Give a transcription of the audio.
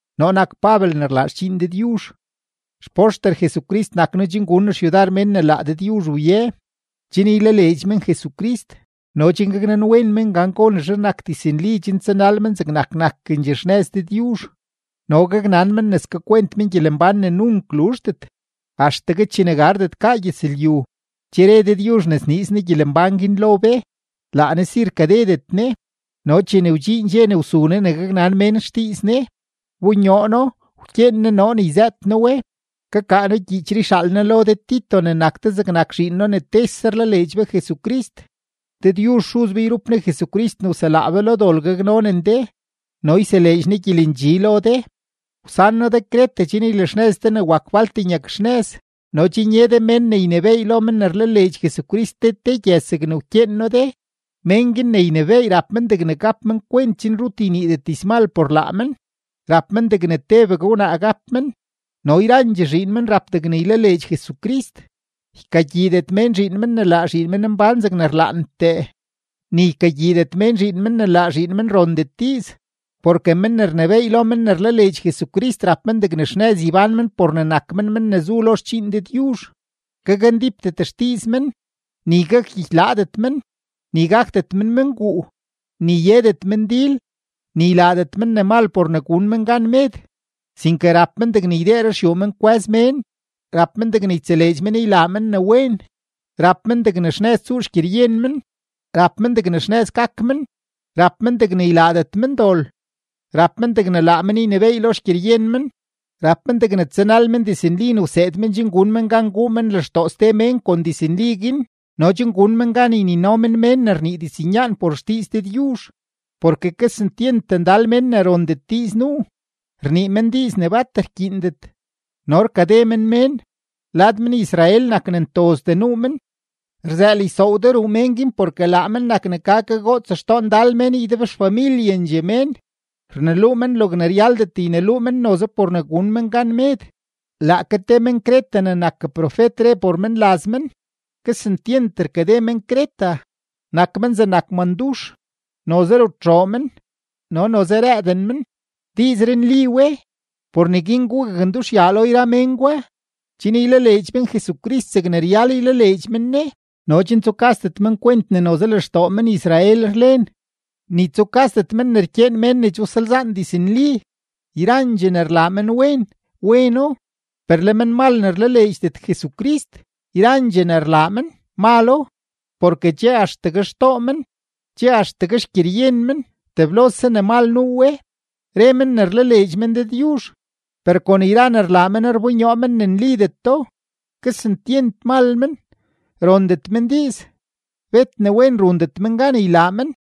Noo nak Pabel ne rlaa xdxiin Dëdyuzh, xpoxter Jesucrist nak noo chen gun noo xyudar mén ne laa Dëdyuzh wye, chen ylaleedx men Jesucrist no chen gaknanwen men gan gonezhe nak diznli chen tsanal men zegnak nakendxee xnëz Dëdyuzh no gaknan men ne skakwent men gyelembán ne nunk luzhdet. Axtegue chene gardet gaa gyëzlyu, che re Dëdyuzh ne sniiz Ne gyelembán guin lo be. Laa Ne si rkadedet Ne. No chene wdxiin dxe ne wsu Ne ne gaknan mén xdiiz Ne, wbonyoo No, wkyeen Ne noo ne yzëët noo we. Kakaa noo gyiichree yxaal noo lo de Tito ne nak de zegnak zhiin noo ne tese rlaleedx be Jesucrist. Dëdyuzh Xuz be yrup Ne Jesucrist ne wselaa be lo dol gaknonen de no yseleedx Ne gyelendxi lo de. Wsan noo de Creta chen ylaxnëz de ne wak falt nyakxnëz no chen ye de mén ne ynebééy lo men ne rlaleedx Jesucrist te te gyëz zegne wkyeen noo de. Mén guin ne ynebééy rap men degne gap men kwent chen rut yniidet dizmal por laa men, rap men degne tebegue wnaa gap men, no yrandxee zhiin men rap degne ylaleedx Jesucrist, ykagyiidet mén zhiin men ne laa zhiin men mbán zegne rlaantee, ni ykagyiidet mén zhiin men ne laa zhiin men rondet diiz. Porke men ne rnebééy lo men ne rlaleedx Jesucrist, rap men degne xnëz ybán men por ne nak men men ne zu lo xdxiin Dëdyuzh; gakndípdet xdiiz men, ni gakgyikylaadet men, ni gakdet men menguu, ni yedet men dil, ni ylaadet men ne mal por ne gun men gan med. Sinke rap men degne ydee ruxyuu men kwë́z mén, rap men degne ytseleedx men ylaa men ne wen, rap men degne xnëz tsuu xgyeryen men, rap men degne xnëz gak men, rap men degne ylaadet men dol, rap men degne laa men ynebééy lo xgyeryen men, rap men degne tsanal men diznli ne wseed men chen gun men gan guu men lextoo ste mén kon diznli guin no chen gun men gan ynino men mén ne rnii diznyaan por xdiiz Dëdyuzh. Porke kesentyent ndal mén ne rondet diiz nuu, rnii men diiz ne bat rkyiindet no rkade men mén; lad men-Israel nak ne ntozdee nuu men. Rzëël ysoow de ruu men guin porke laa men nak ne ka kagoots xtoo ndal mén ydebxfamilyendxee mén, rneluu men logne ryaldet yneluu men noze por ne gun men gan med. Laake te men-Creta ne nak profet re por menlaz men: “Kesentyent rkade men-Creta, nak men zegnak mandux, noze rutxoo men, no noze rëëden men.” Diizree nli we. Por neguin gugaknduxyaa lo yra mén gwa, chen ylaleedx men Jesucrist zegne ryal ylaleedx men Ne no chen tsukasdet men kwent ne noze lextoo men-Israel rlen, ni tsukasdet men ne rkyeen mén ne che wsalzaan diznli. Yrandxee ne rlaa menwen, weno; per le menmal ne rlaleedxdet Jesucrist, yrandxee ne rlaa men, malo, porke che axtegue xtoo men, che axtegue xgyeryen men, teblose ne mal nuu we. Re men ne rlaleedx men Dëdyuzh, per kon yra ne rlaa men rbonyoo men ne nlideto. Kesentyent mal men, rondet men diiz, bet ne wen rundet men gan ylaa men.